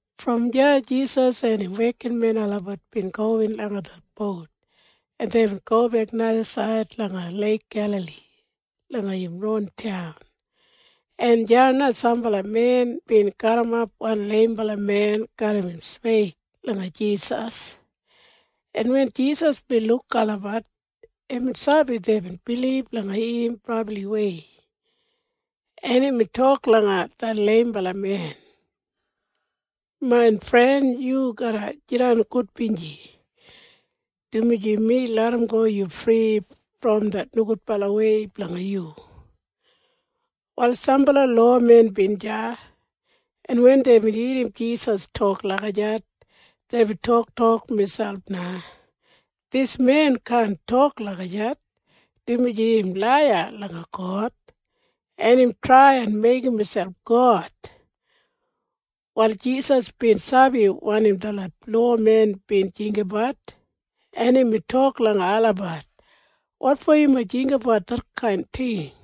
Brom deya Jisas en im wekinmen olabat bin gowin langa det bout en deibin gobek najasaid langa Leik Gelali langa im ron taun, en deya na sambala men bin garrimap wan leimbala men garram im sweig langa Jisas, en wen Jisas bin luk olabat, imbin sabi deibin bilib langa im brabliwei, en imbin tok langa det leimbala men, “Main fren, yu garra jidan gudbinji, dumaji mi larramgo yu fri brom det nogudbalawei blanga yu.” Wal sambala lowamen bin deya, en wen deibin irrim Jisas tok lagijat, deibin toktok miselp na, “Dis men kaan tok lagijat, dumaji im laiya langa God, en im trai en meigim miselp God.” Wal Jisas bin sabi wanim detlot lowamen bin jinggabat, en imbin tok langa olabat, “Wotfo yumob jinggabat detkain ting?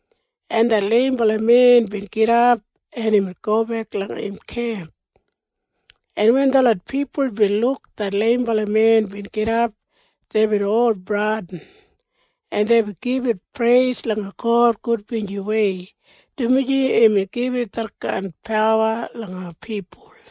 En det leimbala men bin gidap, en imbin gobek langa im kemp, en wen detlot pipul bin luk det leimbala men bin gidap, deibin ol bradin, en deibin gibit preis langa God gudbinjiwei, dumaji imbin gibit detkain pawa langa pipul.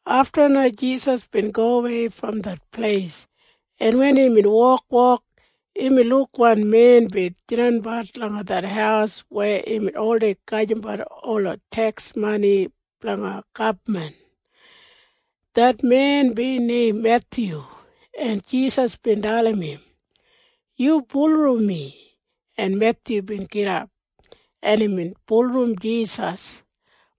Afta na Jisas bin gowei brom det pleis, en wen imbin wokwok, imbin luk wan men bin jidanbat langa det haus weya imbin oldei gajimbat ola teks mani blanga gabman. Det men bin neim Methyu, en Jisas bin dalim im, “Yu bulurrum mi.” En Methyu bin gidap, en imbin bulurrum Jisas.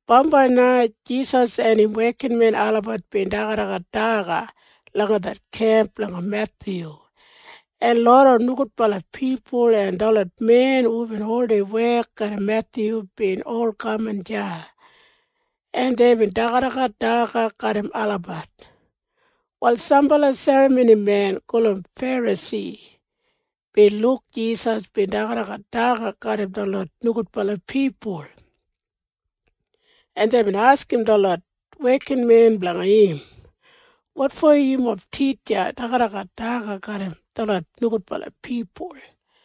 Bambai na Jisas en im wekinmen olabat bin dagadagat daga langa det kemp blanga Methyu, en loda nogudbala pipul en detlot men hubin oldei wek garram Methyu bin ol kaman deya, en deibin dagadagat daga garram olabat. Wal sambala serramonimen gulum Ferasi bin luk Jisas bin dagadagat daga garram detlot nogudbala pipul, en deibin askim detlot wekinmen blanga im, “Wotfo yumob titja dagadagat daga garram detlot nogudbala pipul?”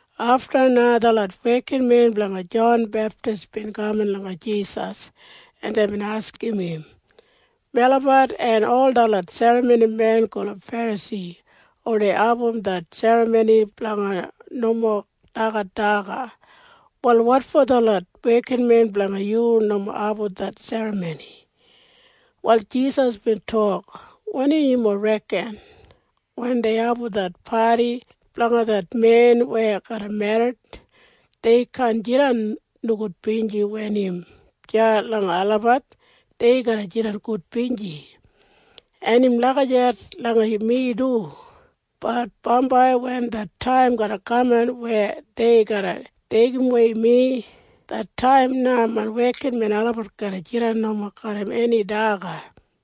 Afta na detlot wekinmen blanga Jon Beptis bin kaman langa Jisas, en deibin askim im, “Melabat en ol detlot serramonimen gulum Ferasi oldei abum det serramoni blanga nomo dagat daga. Wal wotfo detlot wekinmen blanga yu nomo abum det serramoni?” Wal Jisas bin tok, “Wanim yumob reken? Wen dei abum det padi blanga det men weya garra merrit, dei kaan jidan nogudbinji wen im deya langa olabat. Dei garra jidan gudbinji. En im lagijat langa mi du. Bat bambai wen det taim garra kaman weya dei garra deigidawei mi, det taim na main wekinmen olabat garra jidan nomo garram eni daga.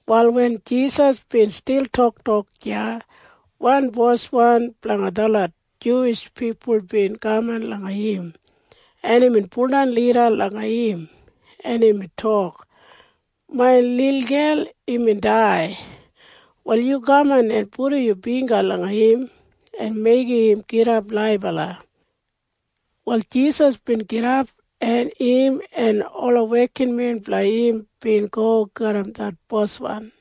Wal wen Jisas bin stil toktok deya, wan boswan blanga detlot Juwish pipul bin kaman langa im, en imbin baudan lida langa im, en imbin tok, “Main lilgel imbin dai. Wal yu kaman en pudum yu bingga langa im en meigim im gidap laibala.” Wal Jisas bin gidap, en im en ola wekinmen blanga im bin go garram det boswan.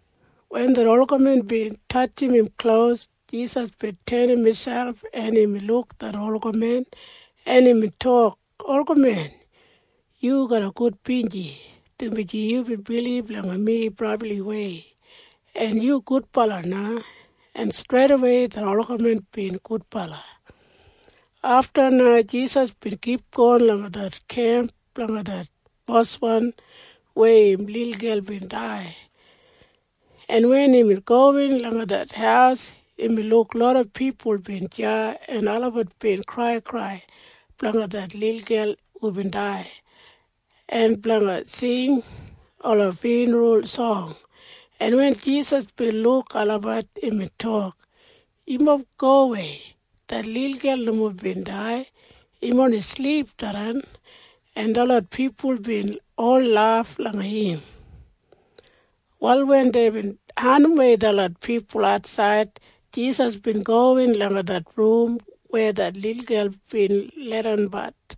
Wen det olgamen bin tatjim im klos, Jisas bin tenim miselp, en imbin luk det olgamen, en imbin tok, “Olgamen, yu garra gudbinji, dumaji yubin bilib langa mi brabliwei. En yu gudbala na.” En streidawei det olgamen bin gudbala. Afta na Jisas bin kipgon langa det kemp blanga det boswan weya im lilgel bin dai, en wen imbin gowin langa det haus, imbin luk loda pipul bin deya en olabat bin kraikrai blanga det lilgel hubin dai, en blanga sing ola fyunral song. En wen Jisas bin luk olabat, imbin tok, “Yumob gowei. Det lilgel nomo bin dai. Im oni silip tharran.” En detlot pipul bin ol laf langa im. Wal wen deibin andimwei detlot pipul atsaid, Jisas bin gowin langa det rum weya det lilgel bin leidanbat,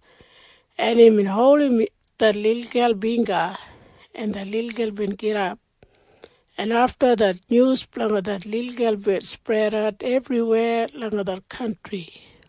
en imbin holdim det lilgel bingga, en det lilgel bin gidap, en afta det nyus blanga det lilgel bin spredat ebriweya langa det kantri.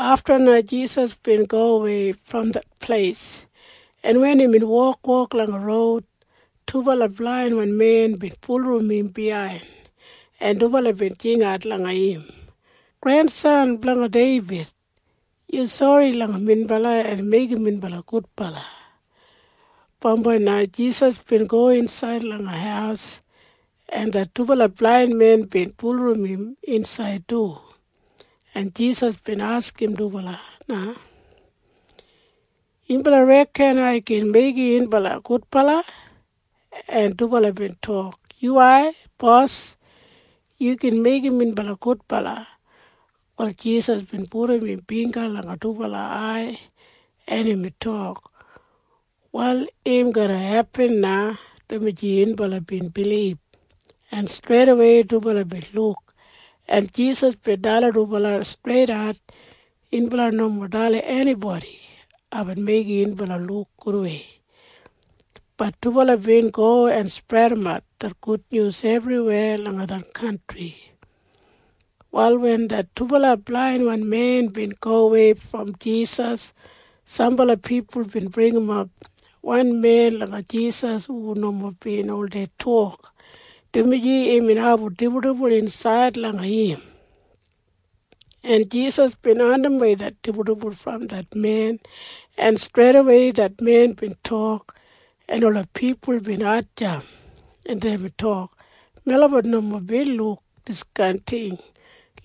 Afta na Jisas bin gowei brom det pleis, en wen imbin wokwok langa roud, dubala blainwan men bin bulurrum im biyain, en dubala bin jingat langa im, “Grengrensan blanga Deibid! Yu sori langa minbala en meigim minbala gudbala!” Bambai na Jisas bin go insaid langa haus, en det dubala blainwan men bin bulurrum im insaid du, en Jisas bin askim dubala na, “Yunbala reken ai gin meigim yunbala gudbala?” En dubala bin tok, “Yuwai, bos! Yu gin meigim minbala gudbala!” Wal Jisas bin pudum im bingga langa dubala ai, en imbin tok, “Wal im garra hepin na, dumaji yunbala bin bilib.” En streidawei dubala bin luk. En Jisas bin dalim dubala streidat, “Yunbala nomo dalim enibodi aibin meigim yunbala luk gudwei.” Bat dubala bin go en spredimat det nyus ebriweya langa det kantri. Wal wen det dubala blainwan men bin gowei brom Jisas, sambala pipul bin bringimap wan men langa Jisas hu nomo bin oldei tok, dumaji imbin abum dibuldibul insaid langa im, en Jisas bin andimwei det dibuldibul brom det men, en streidawei det men bin tok, en ola pipul bin hatjamp, en deibin tok, “Melabat nomo bin luk diskain ting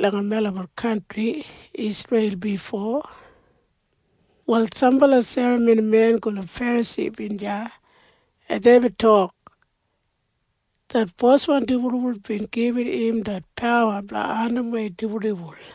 langa melabat kantri Isreil bifo!” Wal sambala serramonimen gulum Ferasi bin deya, en deibin tok, “Det boswan dibuldibul bin gibit im det pawa blanga andimwei dibuldibul.”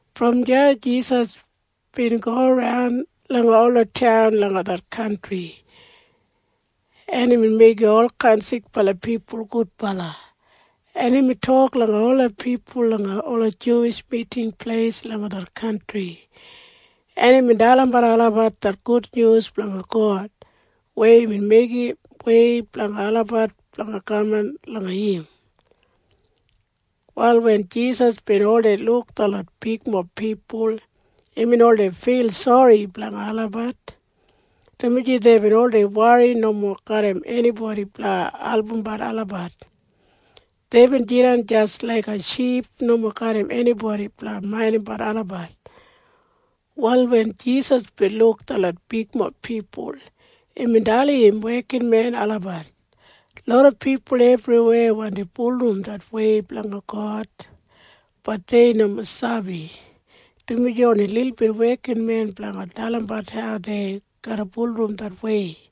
Brom deya Jisas bin goran langa ola taun langa det kantri, en imbin meigim olkain sikbala pipul gudbala, en imbin tok langa ola pipul langa ola Juwish Miting Pleis langa det kantri, en imbin dalimbat olabat det gudnyus blanga God weya imbin meigim wei blanga olabat blanga kaman langa im. Wal wen Jisas bin oldei luk detlot bigmob pipul, imbin oldei fil sori blanga olabat, dumaji deibin oldei wori nomo garram enibodi blanga albumbat olabat. Deibin jidan jis laik ship nomo garram enibodi blanga maindimbat olabat. Wal wen Jisas bin luk detlot bigmob pipul, imbin dalim im wekinmen olabat, “Loda pipul ebriweya wandi bulurrum det wei blanga God. Bat dei nomo sabi, dumaji oni lilbit wekinmen blanga dalim olabat hau dei garra bulurrum det wei.